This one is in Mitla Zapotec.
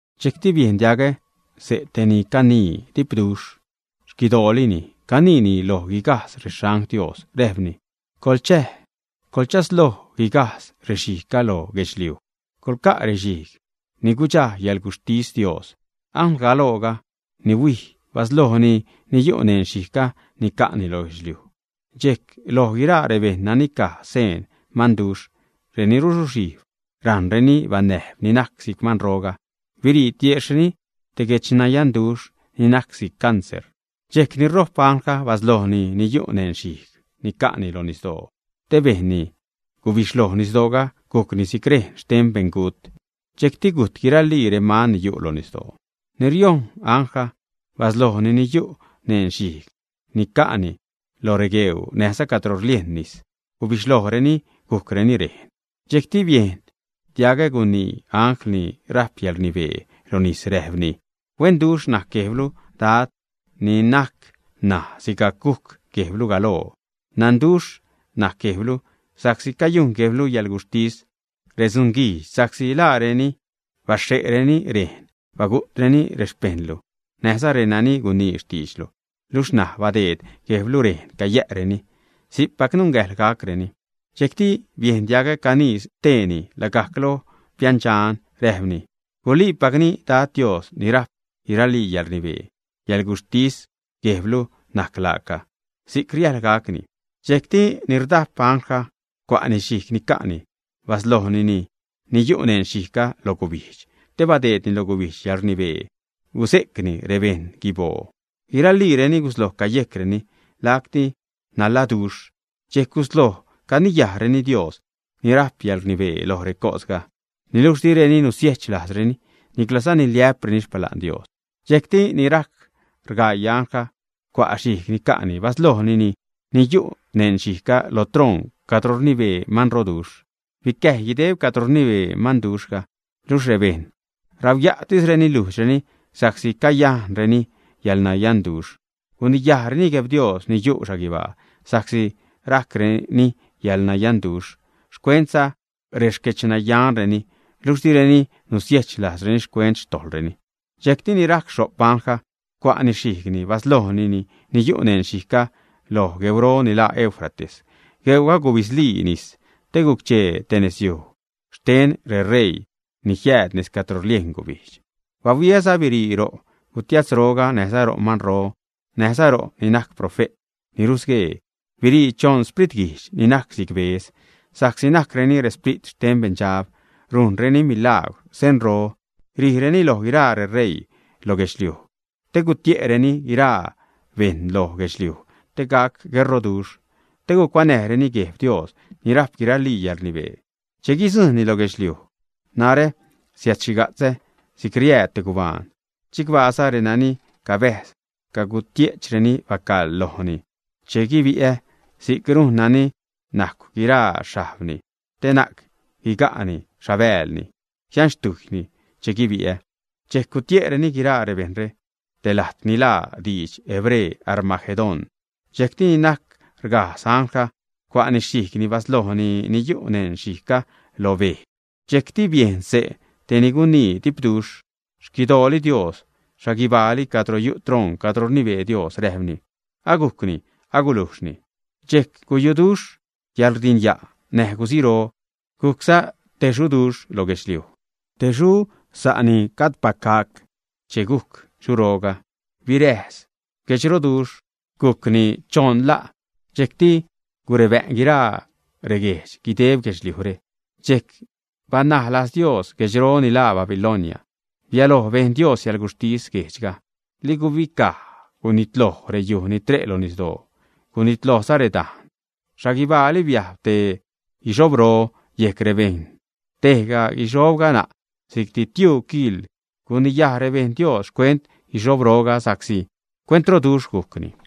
Dxejcti biejn diagä xse' te ni canii dipduxh xquidoolini, caniini loj guigajdz rexangl Dios, räjpni: ―Coḻchäj, coḻchasloj guigajdz rexhijgga lo guedxliuj, coḻca' rexhijg ni guidxa xcäḻguxhtis Dios. Anglgaloo ni huij, baslojni ni yu' neṉ xhijg ni ca'ni lo guedxliuj. Dxejc loj guiraa rebejṉ nani caj xseen manduxh, reni rusuxhijb, rajṉreni banäjb ni najc si'c manroga, birii tiejxhni te guedxyanduxh ni najc si'c cancer. Dxejc ni rojp anglga baslojni ni yu' neṉ xhijg ni ca'ni loj nisdoo, te bejnni gubixhloj nisdooga gujcni si'c rejn xten te beṉgut. Dxejcti gujt guiralii reman ni yu' lo nisdoo. Ni riojṉ anglga baslojni ni yu' neṉ xhijg ni ca'ni loj regueuu näjza cadro rliejn nis. Gubixhlojreni gujcreni rejn. Dxejcti biejn diagä gunii angl ni rajp yäḻrnibee lo nis räjpni: ―Huenduxh najc Guejblu Dad ni najc ṉaj sigajc gujc Guejblu galoo, dxanduxh najc Guejblu sa'csi cayujn Guejblu yäḻguxhtis redzunguijdx. Sa'csi laareni baxhe'reni rejn, bagu'treni rexpejṉlu näjza renani gunii xtiidxlu, luxh ṉaj badeed Guejblu rejn cayä'reni. Si'cpac nungäjḻ gacreni. Dxejcti biejn diagä canii steeni lagajc lo piändxan, räjpni: ―Guliipacni Dad Dios ni rajp guiralii yäḻrnibee, xcäḻguxhtis Guejblu najc laaca, si'c riäjḻ gacni. Dxejcti ni rdajp anglga cua' xhijg ni ca'ni, baslojni ni yu' neṉ xhijgga lo gubijdx, te badeedni lo gubijdx yäḻrnibee guze'cnäjni rebejṉ guiboo. Guiraliireni gusloj cayejcreni, lacti nanladuxh, dxejc gusloj caniyajreni Dios ni rajp yäḻrnibee loj recosga. Niluxh direni nusiechlajzreni, niclaza niliä'preni xpala'n Dios. Dxejcti ni rajc rgaii anglga cua' xhijg ni ca'ni baslojni ni yu' neṉ xhijgga lo troṉ cadro rnibee manroduxh. Bicäjy guideb cadro rnibee manduxhga, luxh rebejṉ rauya'tisreni lujdxreni sa'csi cayajcreni yäḻnayanduxh. Guniyajreni Guejb Dios ni yu' xhaguibaa sa'csi rajcreni yäḻnayanduxh, xcuentza rexquedxnayanreni. Luxh direni nusiechlajzreni xcuent xtojḻreni. Dxejcti ni rajc xho'p anglga cua'ni xhijgni, baslojni ni yu' neṉ xhijgga loj gueuro ni laa Eufrates. Gueuga gubidzlii nisni te guc-chee te nezyuj xten reṟeii ni jiääd nez cadro rliejn gubijdx. Bahuiäza birii ro' gutiatzro, näjza ro' manro, näjza ro' ni najc profe't ni rusguee, birii choṉ spritguijdx ni najc si'c bedz, sa'csi najcreni resprit xten beṉdxab, rujnreni milagwr, senro. Rijreni loj guiraa reṟeii loj guedxliuj te gutie'reni guiraa bejṉ loj guedxliuj te gac gueṟroduxh, te gucuanäjreni Gueb Dios ni rajp guiralii yälṟnibee che guidzujṉni lo guedxliuj. “Narä siädxhiga'tzä si'c riääd te gubaan. Chicbaaza renani cabäjz, cagutie'chreni bacaḻ lojni che guibi'ä si'c rujn nani najcw guiraa xhajbni, te na'c guiga'ni xhabäälni, jianxtujyni che guibi'ä.” Dxejc gutie'reni guiraa rebejṉre te lajt ni laa lo didx hebre “Armagedón”. Dxejcti ni najc rgajdz anglga cua'ni xhijgni baslojni ni yu' neṉ xhijgni loj bej. Dxejcti biejn xse' te ni gunii dipduxh xquidooli Dios xhaguibaali cadro yu' troṉ cadro rnibee Dios, räjpni: ―Agujcni, agulujxhni. Dxejc guyuduxh yäḻrdinya' näj guziro. Gujcza te xuroduxh lo guedxliuj, te xu sa' ni gajdpac gac. Che gujc xuroga, biräjs guedxroduxhga, gujcni choṉ la', dxejcti gurebä'n guiraa reguejdx guideb guedxliujre. Dxejc banaj lajz Dios guedxro ni laa Babilonia, bialoj bejn Dios yäḻguxhtis guedxga. Li gubicaj, gunitloj reyuj ni tre' lo nisdoo, gunitlojza redajn. Xhaguibaali biajb te guixhobro yejc rebejṉ; tejga guixhobga na' si'cti tiuu kiḻ. Guniyaj rebejṉ Dios xcuent guixhobroga, sa'csi cuentroduxh gujcni.